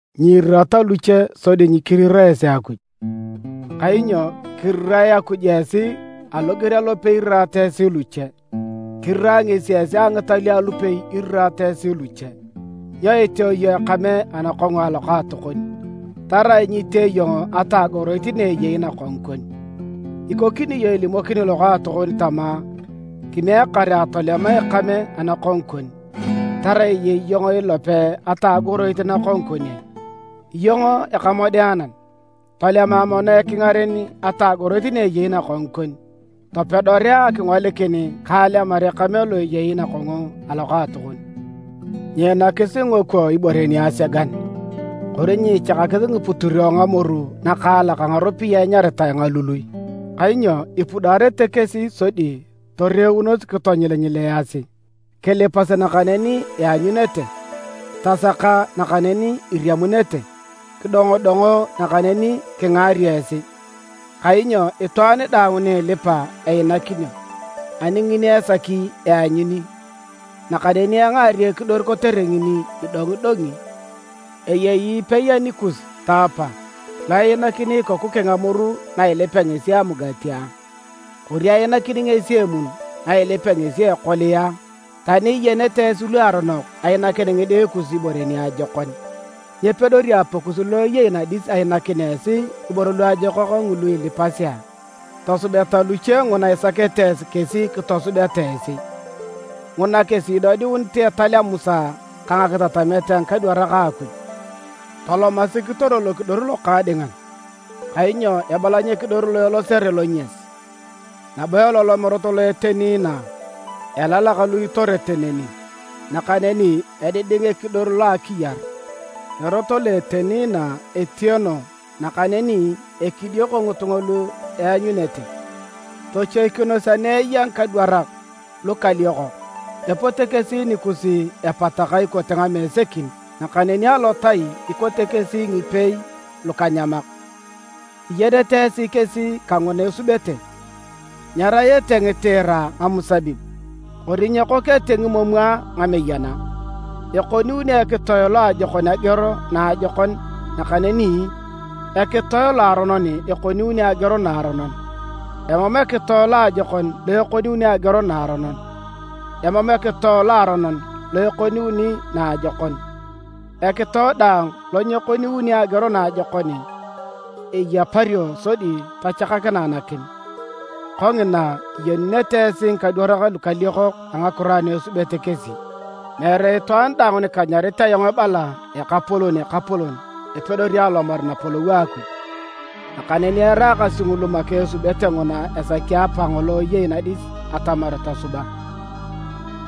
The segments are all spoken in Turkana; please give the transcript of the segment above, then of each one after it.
“Nyiirirata luche sodi nyikirira esi Akuj, kainyo kirirae Akuj esi aloger alopei iriraata esi luche. Kirirae ngesi esi a ngitalio alupei iriraata esi luche. Nyo iteo iyong ekame anakongu a lokaatokon, tarai nyitee iyong atagoroit na eyei nakongu kon? Ikokini iyong ilimokini lokaatokon tama, ‘Kimiek kare atolema ekame anakongu kon’. Tarai eyei iyong ilope atagoroit nakongu kon ai? Iyong ekamodeanan! Tolema mono ekingaren atagoroit na eyei nakongu kon, topedorea akingolikin ka alemar ekame lo eyei nakongu a lokaatokon. “Nyiinakis ngingokwo ibore niasegan, kori nyiichakakis ngiputiro ngamoru nakaalak a ngaropiyae enyaritae ngalului. Kainyo ipudaarete kesi sodi toreunos kitonyilinyilaasi. “Kilipas nakaneni ianyunete. Tasaka nakaneni iriamunete. Kidongodongo nakaneni kingaario esi. Kainyo itwaan daang ni ilipa einakinio, ani ngini esaki eanyuni, nakaneni engaario ekidor kotere ngini idongidongi. Eyei epei anikus, taapa, lo einakini ikoku keng amoru na ilipea ngesi amugati a? Kori einakini ngesi emun na ilipea ngesi ekolia a? Tani iyenete esi luaronok ainakin ngide kus ibore niajokon, nyepedori Apakus lo eyei nadis ainakin esi ngiboro luajokak ngulu ilipasi a? Tosubeta luche nguna isakete esi kesi kitosubeta esi. Nguna kesi idodiunit etal a Musa ka ngakitatamet a ngikadwarak a Akuj. “Tolomasi kitoro lokidor lokaadingan, kainyo ebalany ekidor lo elosere lonyas, nabo elolom erot lo eteni inaa, elalak lu itorete neni. Nakaneni ediding ekidor lo a akiyar. Erot lo eteni inaa etieno nakaneni ekidioko ngitunga lu eanyunete. “Tochoikinos ani eya ngikadwarak lukaliokok. Epote kesi nikus epataka ikote ngamesekin nakaneni alotai ikote kesi ngipeei lukanyamak. Iyenete esi kesi kanguna esubete. Nyerayete ngitiira ngamusabib, kori nyekokete ngimomwa ngameyana. Ekoniuni ekitoe loajokon ageor naajokon nakaneni ekitoe loaronon ekoniuni ageor naaronon. Emam ekitoe loajokon lo ekoniuni ageor naaronon. Emam ekitoe loaronon lo ekoniuni naajokon. Ekitoe daang lo nyekoniuni ageor naajokon eyapario sodi tochakakinae nakim. Kongina, iyenunete esi ngikadwarak lukaliokok a ngakiro ana esubete kesi. “Meere itwaan daang ni kanyarit ayong ebala: ‘Ekapolon, Ekapolon’ epedori alomar Napolou a Akuj, nakaneni eraakasi ngulu make esubete nguna esaki Apakang ngolo eyei nadis atamar tosuba.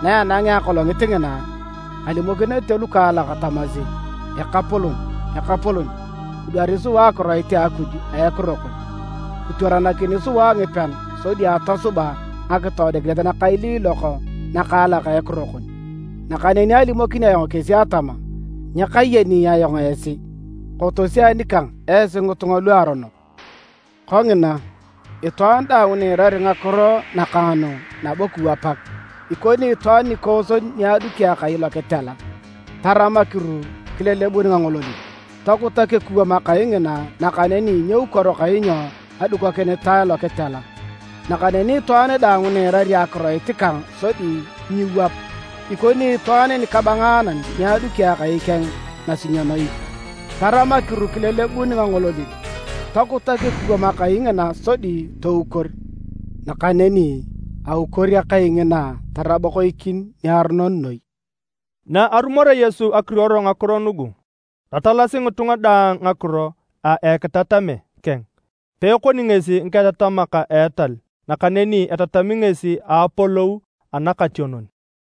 Na enangea Akolongit ngina, kalimokinete lukaalak tamasi: ‘Ekapolon, Ekapolon, kidwari sua akiroit a Akuj a Ekiro kon. Kitwaranakini sua ngipean sodi atosuba ngakitoodikinet nakailiilok nakaalak a Ekiro kon.’ Nakaneni alimokini ayong kesi atama, ‘Nyakayeni ayong esi. Kotosi anikang esi ngitunga luaronok!’ “Kongina, itwaan daang ni iirari ngakiro nakang nu nabo kiwapak, ikoni itwaan nikooson ni aduki akai lokitela. Taram akiru kilelebun ngangololin. Tokutak ekuwam akai ngina nakaneni nyeukoro kainyo adukokinitae lokitela. Nakaneni itwaan daang ni iirari akiroit kang sodi nyiiwap, ikoni itwaan nikabangaanan ni aduki akai keng nasinyonoit. Taram akiru kilelebun ngangololin. Tokutak ekuwam akai ngina sodi toukor. Nakaneni aukor akai ngina tarabokoikin niaronon noi.” Na arumorea Yesu ekiruor ngakiro nugu, tatalasi ngitunga daang ngakiro a ekitatame keng. Peekoni ngesi ngiketatamak a etal, nakaneni etatami ngesi a apolou anatikationon.